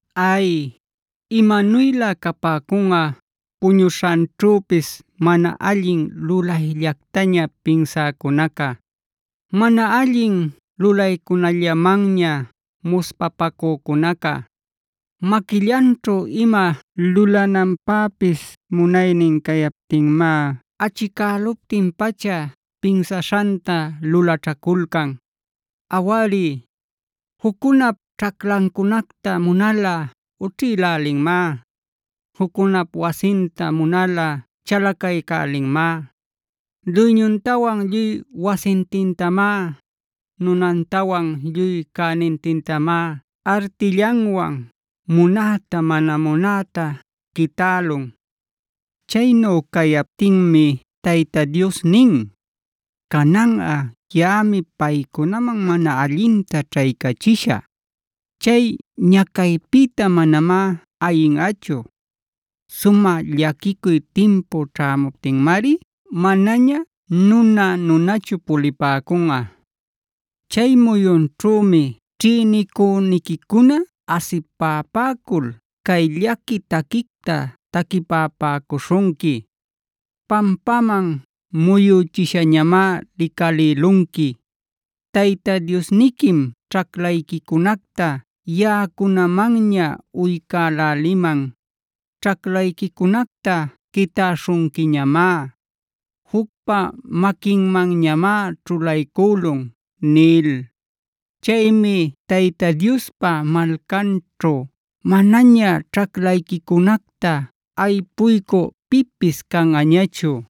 Ay, imanuylä capäcunꞌa puñuśhanćhüpis mana allin lulayllactaña pinsäcunaca, mana allin lulaycunällamanña muspapacücunaca. Maquillanćhu ima lulananpäpis munaynin cayaptinmá achicäluptin-pacha pinsaśhanta lulaćhaculcan. Awari, juccunap ćhaclancunacta munalꞌa ućhïlälinmá; juccunap wasinta munalꞌa chalacaycälinmá. Duyñuntawan lluy wasintintamá, nunantawan lluy cänintintamá artillanwan munäta mana munäta quitälun. Chaynu cayaptinmi Tayta Dios nin: “Cananꞌa, yaꞌami paycunaman mana allinta ćhaycachishä; chay ñacaypïta manamá ayinꞌachu. Sumä llaquicuy timpu ćhämuptinmari manaña nuna-nunachu pulipäcunꞌa. Chay muyunćhümi ćhïnicüniquicuna asipapäcul cay llaqui taquicta taquipapäcuśhunqui: ‘Pampaman muyüchishañamá licalïlunqui. Tayta Diosniquim ćhaclayquicunacta yaꞌacunamanña uycäläliman. Ćhaclayquicunacta quitäśhunquiñamá. Jucpa maquinmanñamá ćhulaycülun’” nil. Chaymi Tayta Diospa malcanćhu manaña ćhaclayquicunacta aypuycü pipis canꞌañachu.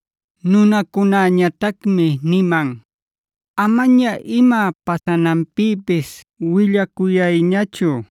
Nunacunäñatacmi niman: “Amaña ima pasananpïpis willacuyayñachu.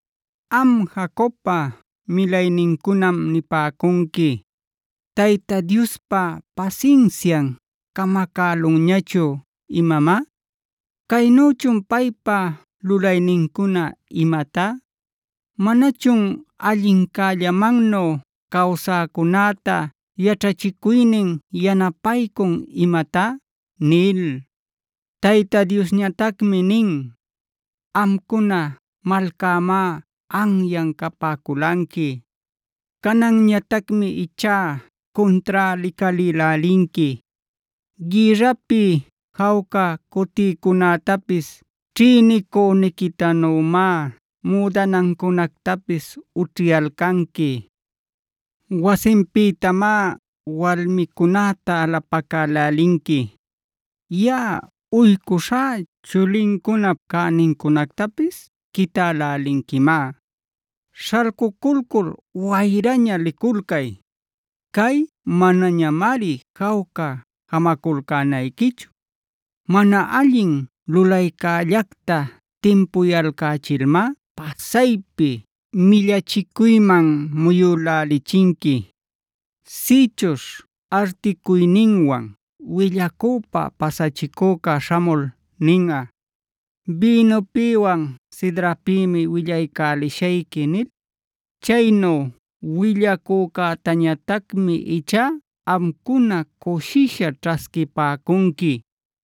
Am Jacobpa milaynincunam nipäcunqui: “¿Tayta Diospa pasinsian camacälunñachun imamá? ¿Caynüchun paypa lulaynincuna imatá? ¿Manachun allincämannu cawsäcunäta yaćhachicuynin yanapaycun imatá?” nil. Tayta Diosñatacmi nin: “Amcuna malcämá anyan capäculanqui; cananñatacmi ichá cuntrá licalïlälinqui. Gïrrapi jawca cutïcunätapis ćhïnicüniquitanümá müdanancunactapis ućhiyalcanqui. Wasinpïtamá walmicunäta alapacälälinqui. Yaꞌa uycuśhá chulincunap cänincunactapis quitälälinquimá. “¡Śhalcuculcul wayraña liculcay! Cay manañamari jawca jamaculcänayquichu. Mana allin lulaycällacta timpuyalcächilmá pasaypi millachicuyman muyülächinqui. Sïchuśh articuyninwan willacüpa pasachicüca śhamul ninꞌa: ‘Bïnupïwan sidrapïmi willaycälishayqui’ nil; chaynu willacücätañatacmi ichá amcuna cushisha ćhasquipäcunqui.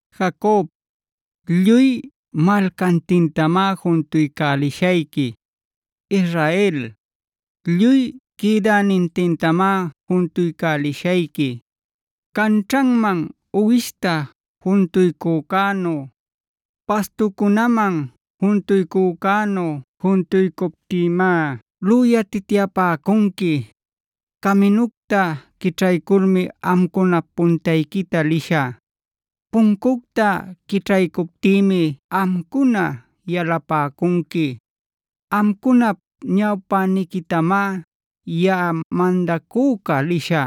“Jacob, lluy malcantintamá juntuycälishayqui. Israel, lluy quïdänintintamá juntuycälishayqui. Canćhanman uwishta juntuycücänu, pastucunäman juntuycücänu juntuycuptïmá lüyatityapäcunqui. Caminucta quićhayculmi amcunap puntayquita lishä. Puncucta quićhaycuptïmi amcuna yalapäcunqui. Amcunap ñawpäniquitamá yaꞌa mandacüca lishä;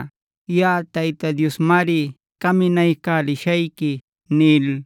yaꞌa Tayta Diosmari caminaycälishayqui” nil.